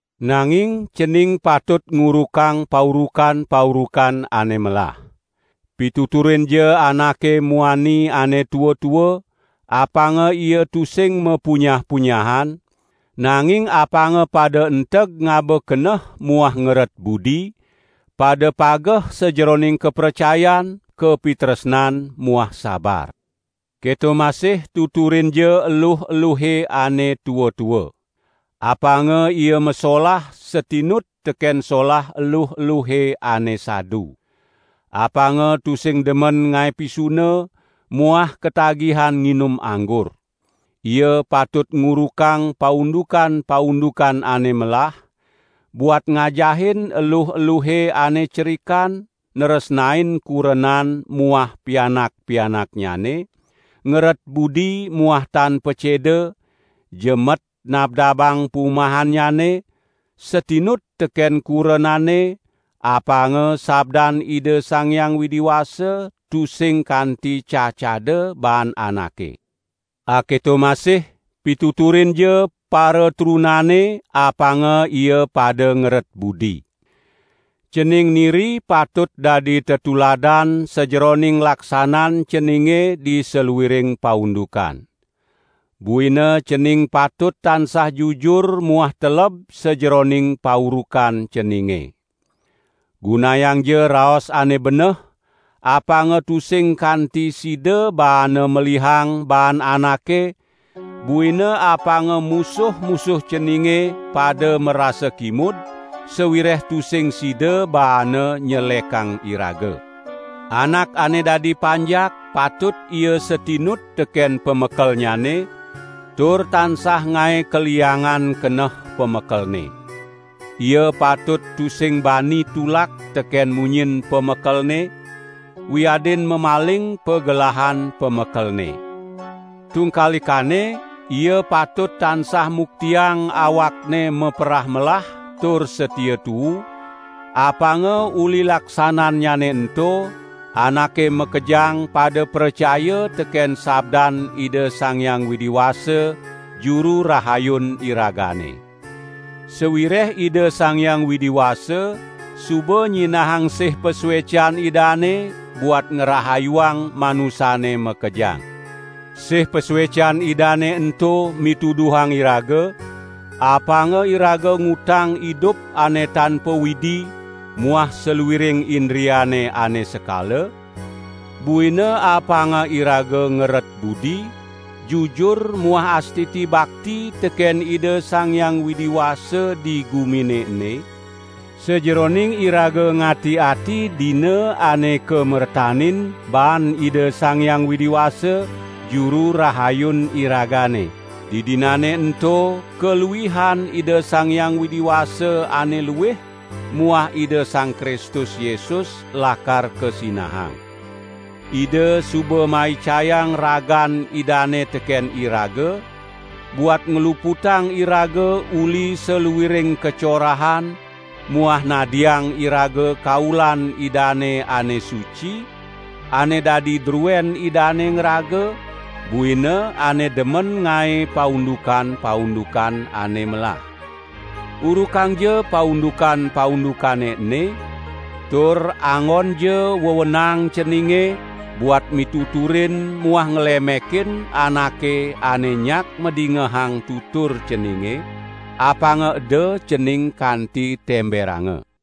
Nanging cening patut ngurukang paurukan-paurukan ane melah. Pituturinja anake muani ane tua-tua, apanga ia tusing mapunyah-punyahan, nanging apanga pada enteg ngaba keneh muah ngeret budi, pada pageh sajeroning kapracayan, kapitresnan muah sabar. Keto masih tuturinja eluh-eluhe ane tua-tua. Apanga ia masolah satinut teken solah eluh-eluhe ane sadu. Apanga tusing demen ngae pisuna muah katagihan nginum anggur. Ia patut ngurukang paundukan-paundukan ane melah, buat ngajahin eluh-eluhe ane cerikan nresnain kurenan muah pianak-pianaknyane, ngeret budi muah tan paceda, jemet nabdabang pumahannyane, satinut teken kurenane, apanga sabdan Ida Sang Hyang Widi Wasa tusing kanti cacada baan anake. Aketo masih pituturinja paratrunane apanga ia pada ngeret budi. Cening niri patut dadi tetuladan sajeroning laksanan ceninge di saluiring paundukan. Buina cening patut tansah jujur muah teleb sajeroning paurukan ceninge. Gunayangja raos ane beneh, apanga tusing kanti sida baana melihang baan anake, buina apanga musuh-musuh ceninge pada marasa kimud, sawireh tusing sida baana nyelekang iraga. Anak ane dadi panjak patut ia satinut teken pamekelnyane, tur tansah ngae kaliangan keneh pamekelne. Ia patut tusing bani tulak teken munyin pamekelne, wiadin mamaling pagelahan pamekelne. Tungkalikane ia patut tansah muktiang awakne maperah melah tur satia tuu, apanga uli laksanannyane ento, anake makejang pada pracaya teken sabdan Ida Sang Hyang Widi Wasa, Juru Rahayun iragane. Sawireh Ida Sang Hyang Widi Wasa suba nyinahang sih pasuecan Idane buat ngrahayuang manusane makejang. Sih pasuecan Idane ento mituduhang iraga, apanga iraga ngutang idup ane tan pawidi muah saluiring indriane ane sekala, buina apanga iraga ngeret budi, jujur muah astiti bakti teken Ida Sang Hyang Widi Wasa di gumine ene, sajeroning iraga ngati-ati dina ane kamertanin baan Ida Sang Hyang Widi Wasa, Juru Rahayun iragane. Didinane ento kaluihan Ida Sang Hyang Widi Wasa ane luih muah Ida Sang Kristus Yesus lakar kasinahang. Ida suba maicayang ragan Idane teken iraga, buat ngluputang iraga uli saluiring kacorahan muah nadiang iraga kaulan Idane ane suci, ane dadi druen Idane ngraga, buina ane demen ngae paundukan-paundukan ane melah. Urukangja paundukan-paundukane ene, tur anggonja wewenang ceninge buat mituturin muah nglemekin anake ane nyak madingehang tutur ceninge, apanga eda cening kanti temberanga.